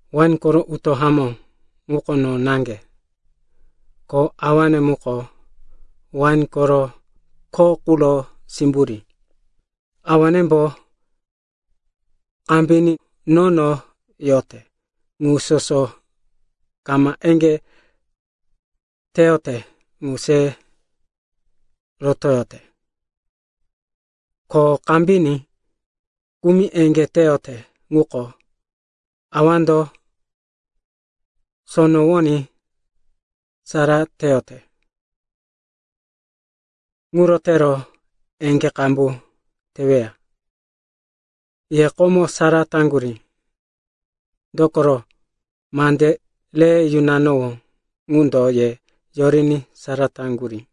“Wain koro utó hamó ŋuko no naŋge. Ko Awane muko wain koro kho quro simburí. Awanembo kambiní nono yote ŋu soso kama eŋgé teyote ŋu se rotoyote. Ko kambiní kumi eŋgé teyote ŋuko, Awando sonowoní sara teyote, ŋuro tero eŋgé qambu teweya. Ye komo sara taŋgurí, dokoro mande re yunanowó ŋundo ye yoriní sara taŋgurí.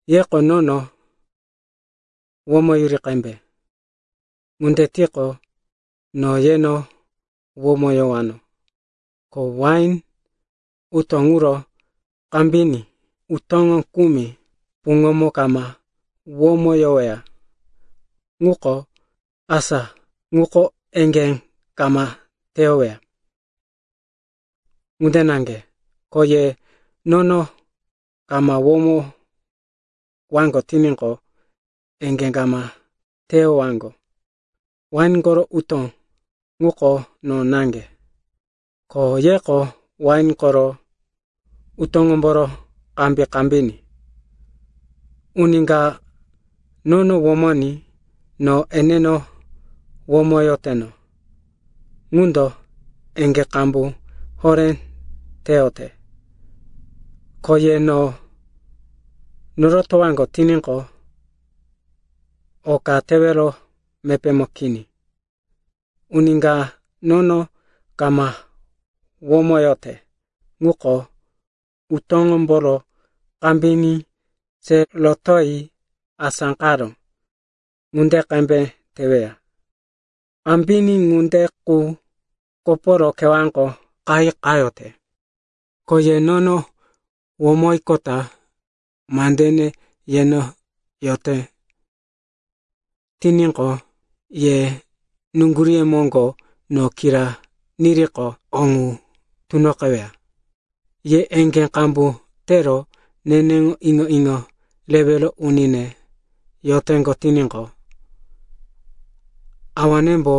Yeko nono womoyuri qembe. Ŋunde tiqo, no yeno womoyowano. Ko wain utó ŋuro kambiní utóŋo kumi puŋomo kama womoyoweya quko, asa ŋuko eŋgé kama teyoweya. Ŋunde naŋge, ko ye nono kama womoyowaŋgo tiníqo, eŋgé kama teyowaŋgo. “Wain koro utó ŋuko no naŋge, ko yeko wain koro utóŋomboro kambi-kambiní. Uni ka nono womoní no eneno womoyoteno ŋundo eŋgé qambu horé teyote. Ko ye no norotowaŋgo tiníqo, oka tewero mepémo kini. Uni ka nono kama womoyote ŋuko utóŋomboro kambiní se rotoyi asáqaró ŋunde qembe teweya. Kambiní ŋunde qu koporo kewáko qayi qayote. Ko ye nono womoyiqota mandene yeno yote tiníqo, ye nuŋguríye moŋgo no kira niriqo, o ŋu tunoqeweya. Ye eŋgé qambu tero neneŋo iŋo-iŋo rewero unine yoteŋgo tiníqo, Awanembo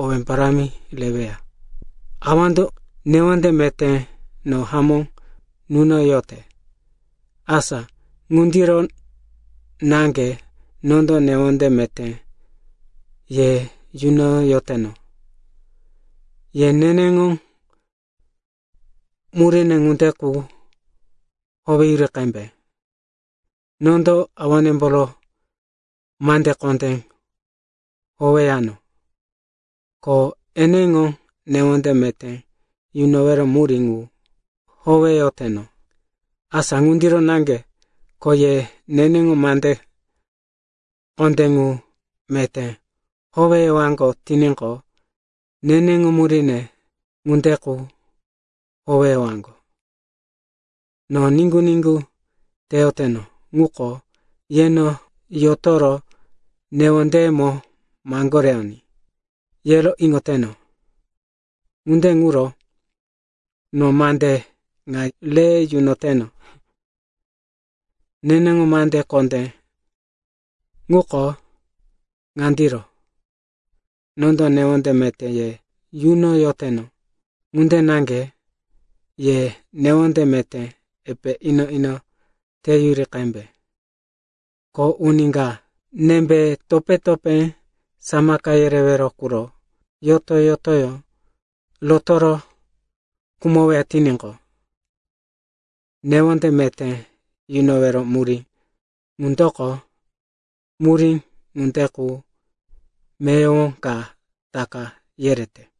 owé parámi reweya. “Awando newonde meté no hamó nunoyote, asa ŋundiro naŋge nondo newonde meté ye yunoyoteno. Ye neneŋo muríne ŋunde qu howeyuri qembe. Nondo Awanemboro mande kondé howeyano, ko eneŋo newonde meté yunowero murí ŋu howeyoteno. Asa ŋundiro naŋge ko ye neneŋo mande kondé ŋu meté howeyowaŋgo tiníqo, neneŋo muríne ŋunde qu howeyowaŋgo. “No niŋgu-niŋgu teyoteno ŋuko yeno yotoro newondeyemo maŋgoreyoní, yero iŋoteno. Ŋunde ŋuro no mande ŋa re yunoteno. Neneŋo mande kondé ŋuko ŋandiro, nondo newonde meté ye yunoyoteno, ŋunde naŋge ye newonde meté epe ino-ino teyuri qembe. Ko uni ka nembe topé-topé samaka yerewero quro yoto-yotoyó rotoro khumoweya tiníqo, newonde meté yunowero murí ŋundoko murí ŋunde qu meyowo ka taka yerete.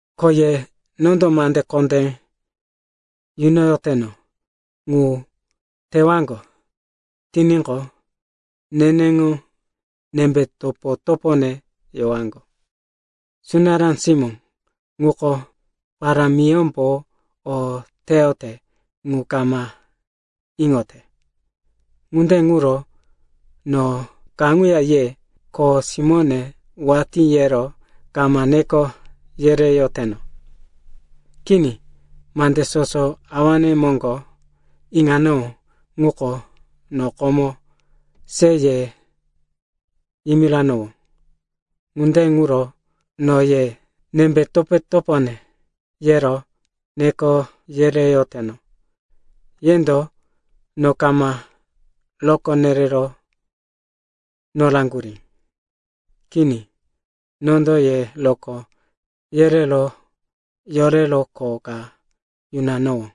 “Ko ye nondo mande kondé yunoyoteno ŋu tewaŋgo tiníqo, neneŋo nembe topo-topone yowaŋgo. Sunará simó ŋuko parámiyómbo o teyote ŋu kama iŋote. Ŋunde ŋuro no kaŋuya ye, ‘kho simóne,’ watí yero kama neko yereyoteno, kini. Mande soso Awane moŋgo iŋanowó ŋuko no komo se ye yimiranowó. Ŋunde ŋuro no ye, ‘nembe topo-topone,’ yero neko yereyoteno. Yendo no kama rokó nerero noraŋgurí. Kini, nondo ye rokó yerero yorero kho ka yunanowó.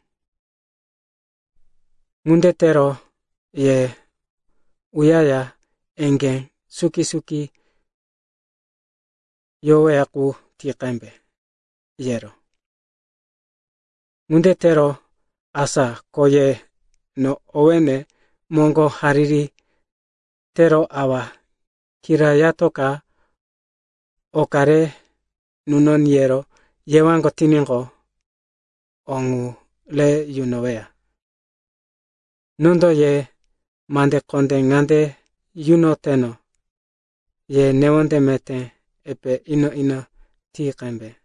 Ŋunde tero ye uyaya eŋgé suki-suki yoweya qu ti qembe yero. Ŋunde tero asa ko ye no owéne moŋgo hariri tero Awa kirayatoka oka re nunoní yero yewaŋgo tiníqo, o ŋu re yunoweya. Nondo ye mande kondé ŋande yunoteno, ye newonde meté epe ino-ino ti qembe.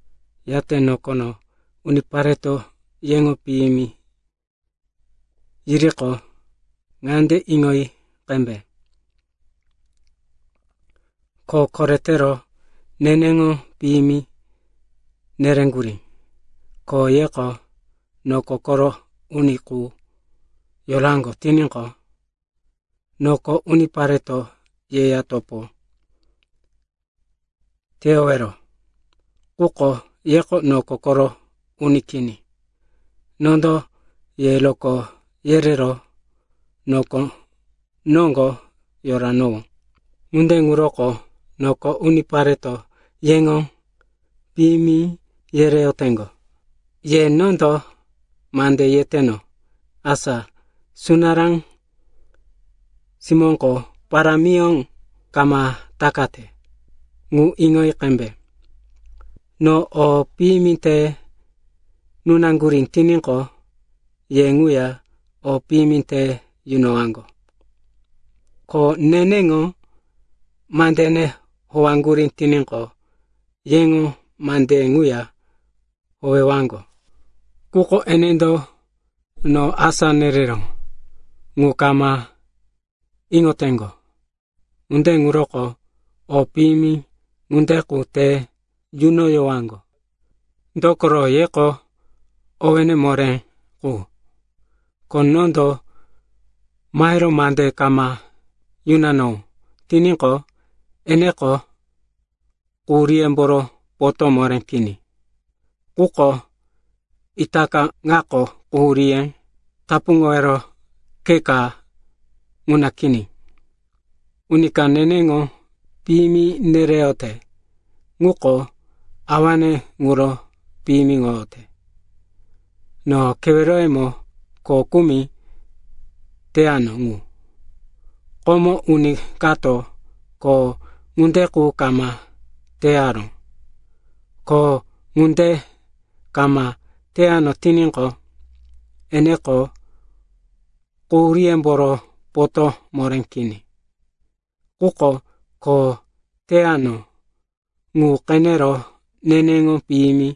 “Yate nokono unipareto yeŋo piyimi yiriqo, ŋande iŋoyi qembe, ko koretero neneŋo piyimi nereŋgurí. Ko yeko noko koro uni qu yoraŋgo tiníqo, noko unipareto yeya topo teyowero. Quko yeko noko koro uni kini. Nondo ye rokó yerero noko noŋgo yoranowó. Ŋunde ŋuro noko unipareto yeŋo piyimi yereyoteŋgo. Ye nondo mande yeteno, asa sunará simóko parámiyó kama takate, ŋu iŋoyi qembe. No o piyimi te nunaŋgurí tiníqo, ye ŋuya o piyimi te yunowaŋgo. Ko neneŋo mandene howaŋgurí tiníqo, yeŋo mandeye ŋuya howewaŋgo. Quko enendo no asá nereró ŋu kama iŋoteŋgo. Ŋunde ŋuroko o piyimi ŋunde qu te yunoyowaŋgo, dokoro yeko owéne moré qu. Ko nondo mahero mande kama yunanowó tiníqo, eneko quhuríyemboro potó moré kini. Quko itaka ŋako quhuríye tapuŋowero khe ka ŋuna kini. Uni ka neneŋo piyimi nereyote ŋuko Awane ŋuro piyimiŋoyote. No keweroyemo kho kumi teyano ŋu, komo uni kato kho ŋunde qu kama teyaró. Ko ŋunde kama teyano tiníqo, eneko quhuríyemboro potó moré kini. Quko kho teyano ŋu qenero neneŋo piyimi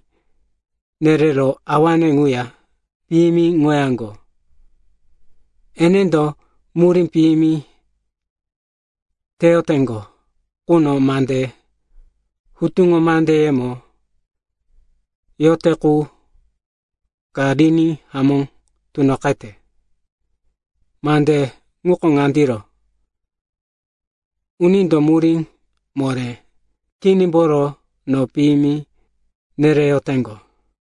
nerero Awane ŋuya piyimiŋoyaŋgo. Enendo murí piyimi teyoteŋgo ŋundo mande hutuŋo mandeyemo yote qu ka riní hamó tunoqete. Mande ŋuko ŋandiro, ‘Unindo murí moré kinimboro no piyimi nereyoteŋgo.’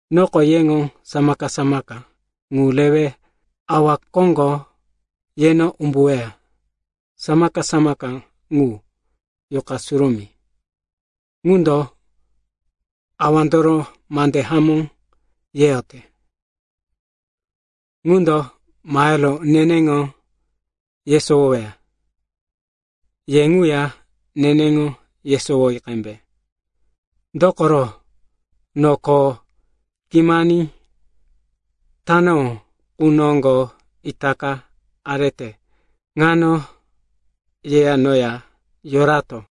“Nondo yeŋo samaka-samaka ŋu rewe Awa koŋgo yeno umbuweya. Samaka-samaka ŋu, Yuqa Surumí, ŋundo Awandoro mande hamó yeyote. Ŋundo mahero neneŋo yesowoweya. Ye ŋuya neneŋo yesowoyi qembe. Dokoro, no kho kimani tanowó qu noŋgo itaka arete ŋano yeya noya yorato.